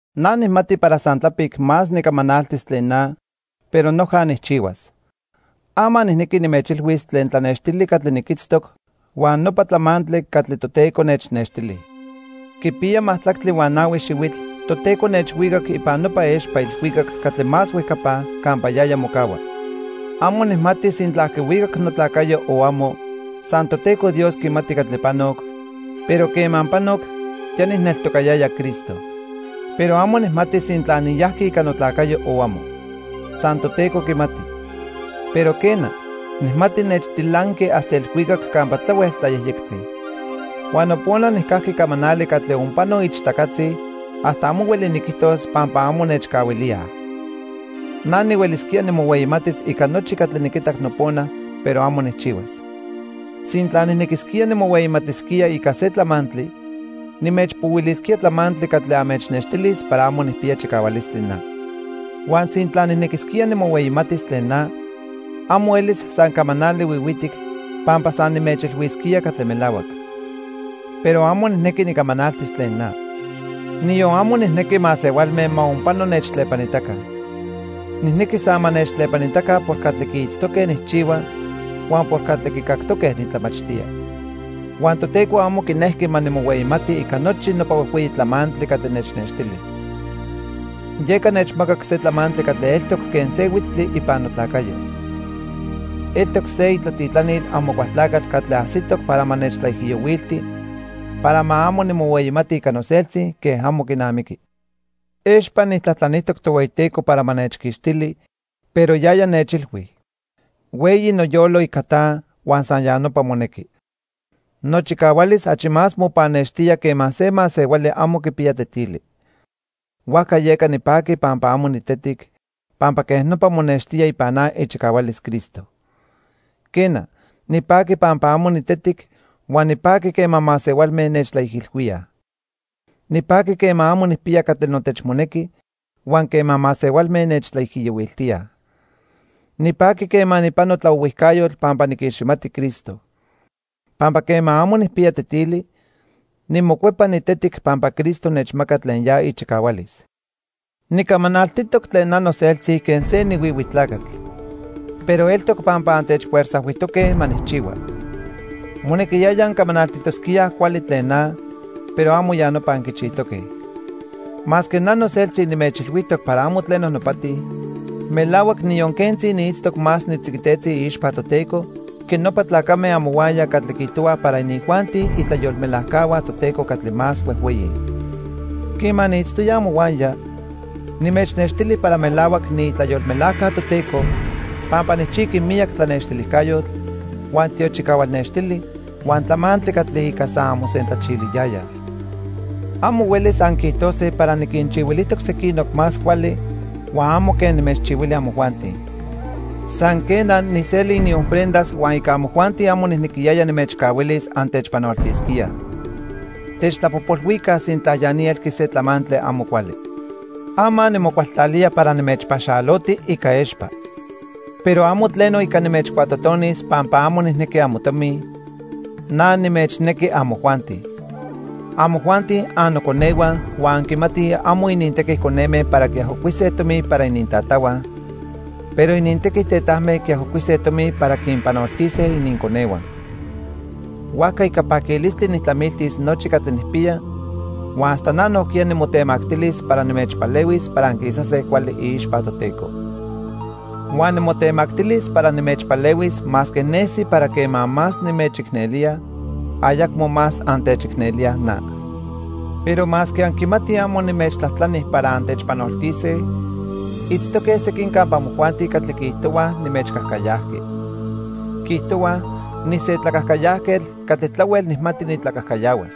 Na nijmati para san tlapic más nicamanaltis tlen na, pero noja nijchihuas. Ama nijnequi nimechilhuis tlen tlanextili catli niquitztoc huan nopa tlamantli catli Toteco nechnextili. Quipiya majtlactli huan nahui xihuitl Toteco nechhuicac ipan nopa expa ilhuicac catli más huejcapa campa yaya mocahua. Amo nijmati sintla quihuicac notlacayo o amo, san Toteco Dios quimati catli panoc, pero quema panoc ya nijneltocayaya Cristo. Pero amo nijmati sintla niyajqui ica notlacayo o amo. San Toteco quimati. Pero, quena, nijmati nechtilanqui hasta ilhuicac campa tlahuel tlayejyectzi. Huan nopona nijcajqui camanali catli onpano ichtacatzi hasta amo hueli niquijtos pampa amo nechcahuilíaj. Na nihuelisquía nimohueyimatis ica nochi catli niquitac nopona, pero amo nijchihuas. Sintla nijnequisquía nimohueyimatisquía ica se tlamantli, nimechpohuilisquía tlamantli catli anmechnextilis para amo nijpiya chicahualistli na. Huan sintla nijnequisquía nimohueyimatis tlen na, amo elis san camanali huihuitic pampa san nimechilhuisquía catli melahuac. Pero amo nijnequi nicamanaltis tlen na. Niyon amo nijnequi masehualme ma onpano nechtlepanitaca. Nijnequi san ma nechtlepanitaca por catli quiitztoque nijchihua huan por catli quicactoque nitlamachtía. Huan Toteco amo quinejqui ma nimohueyimati ica nochi nopa huejhueyi tlamantli catli nechnextili. Yeca nechmacac se tlamantli catli eltoc quen se huitztli ipan notlacayo. Eltoc se itlatitlanil Amocualtlacatl catli ajsitoc para ma nechtlaijiyohuilti para ma amo nimohueyimati ica noseltzi quen amo quinamiqui. Expa nijtlajtlanijtoc Tohueyiteco para ma nechquixtili, pero yaya nechilhui: "Hueyi noyolo ica ta huan san ya nopa monequi. Nochicahualis achi más mopannextía quema se masehuali amo quipiya tetili." Huajca yeca nipaqui pampa amo nitetic, pampa quej nopa monextía ipan na ichicahualis Cristo. Quena, nipaqui pampa amo nitetic huan nipaqui quema masehualme nechtlaijilhuíaj. Nipaqui quema amo nijpiya catli notechmonequi huan quema masehualme nechtlaijiyohuiltíaj. Nipaqui quema nijpano tlaohuijcayotl pampa niquiximati Cristo. Pampa quema amo nijpiya tetili, nimocuepa nitetic pampa Cristo nechmaca tlen ya ichicahualis. Nicamanaltitoc tlen na noseltzi quen se nihuihui tlacatl. Pero eltoc pampa antechfuerzajhuijtoque ma nijchihua. Monequiyaya ancamanaltitosquíaj cuali tlen na, pero amo ya nopa anquichijtoque. Masque na noseltzi nimechilhuijtoc para amo tleno nopati, melahuac niyon quentzi niitztoc más nitziquitetzi iixpa Toteco que nopa tlacame amohuaya catli quiijtohuaj para inijuanti itlayolmelajcahua Toteco catli más huejhueyi. Quema niitztoya amohuaya, nimechnextili para melahuac niitlayolmelajca Toteco pampa nijchijqui miyac tlanextilijcayotl, huan tiochicahual nextili huan tlamantli catli ica san anmosentlachiliyayaj. Amo huelis anquiijtose para niquinchihuilijtoc sequinoc más cuali huan amo quen nimechchihuili amojuanti. San, quena, nijseli iniofrendas huan ica amojuanti amo nijnequiyaya nimechcahuilis antechpanoltisquíaj. Techtlapojpolhuica sintla ya ni elqui se tlamantli amo cuali. Ama nimocualtlalía para nimechpaxaloti ica expa. Pero amo tleno ica nimechcuatotonis pampa amo nijnequi amotomi, na nimechnequi amojuanti. Amojuanti annoconehua huan anquimatij amo inintequi coneme para quiajocuise tomi para inintatahua, pero inintequi tetajme quiajocuise tomi para quinpanoltise ininconehua. Huajca ica paquilistli nijtlamiltis nochi catli nijpiya huan hasta na nojquiya nimotemactilis para nimechpalehuis para anquisase cuali iixpa Toteco. Huan nimotemactilis para nimechpalehuis masque nesi para quema más nimechicnelía, ayacmo más antechicnelíaj na. Pero masque anquimatij amo nimechtlajtlani para antechpanoltise, itztoque sequin campa amojuanti catli quiijtohuaj nimechcajcayajqui. Quiijtohuaj, nise tlacajcayajquetl catli tlahuel nijmati nitlacajcayahuas.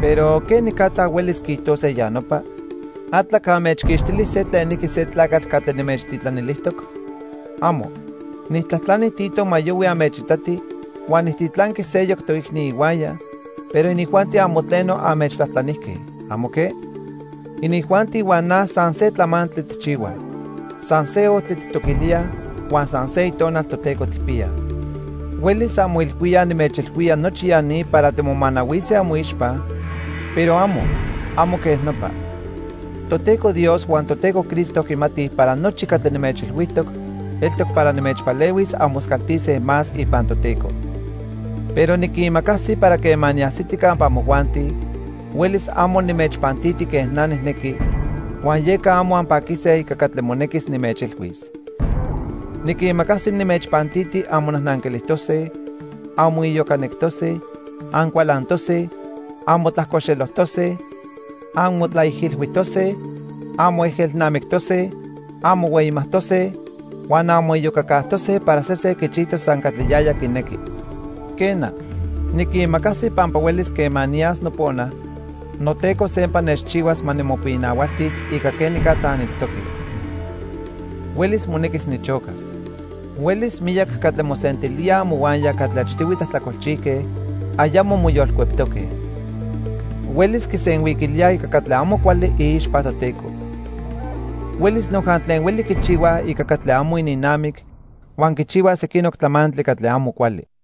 Pero ¿quenicatza huelis quiijtose ya nopa? ¿Atlac anmechquixtili se tlenijqui se tlacatl catli nimechtitlanilijtoc? ¡Amo! Nijtlajtlani Tito ma yohui anmechitati huan nijtitlanqui seyoc toicni ihuaya, pero inijuanti amo tleno anmechtlajtlanijque. ¿Amo que? Inijuanti huan na san se tlamantli tijchihuaj. San se ojtli tijtoquilíaj huan san se Itonal Toteco tijpiyaj. Huelis anmoilhuíaj nimechilhuía nochi ya ni para timomanahuise amoixpa, pero amo, amo quej nopa. Toteco Dios huan Toteco Cristo quimatij para nochi catli nimechilhuijtoc eltoc para nimechpalehuis anmoscaltise más ipan Toteco. Pero niquimacasi para quema niajsiti campa amojuanti, huelis amo nimechpantiti quen na nijnequi, huan yeca amo anpaquise ica catli monequis nimechilhuis. Niquimacasi nimechpantiti anmonajnanquilijtose, anmoiyocanectose, ancualantose, anmotlajcoxelojtose, anmotlaijilhuijtose, anmoejelnamictose, anmohueyimajtose huan anmoiyocacajtose para sesen quichijtos san catli yaya quinequi. Quena, niquimacasi pampa huelis quema niyas nopona, noTeco sempa nechchihuas ma nimopinahualtis ica quenicatza anitztoque. Huelis monequis nichocas. Huelis miyac catli mosentilíaj amohuaya catli achtihui tlajtlacolchijque ayamo moyolcueptoque. Huelis quisenhuiquilíaj ica catli amo cuali iixpa Toteco. Huelis noja tlen hueli quichihuaj ica catli amo ininnamic huan quichihuaj sequinoc tlamantli catli amo cuali.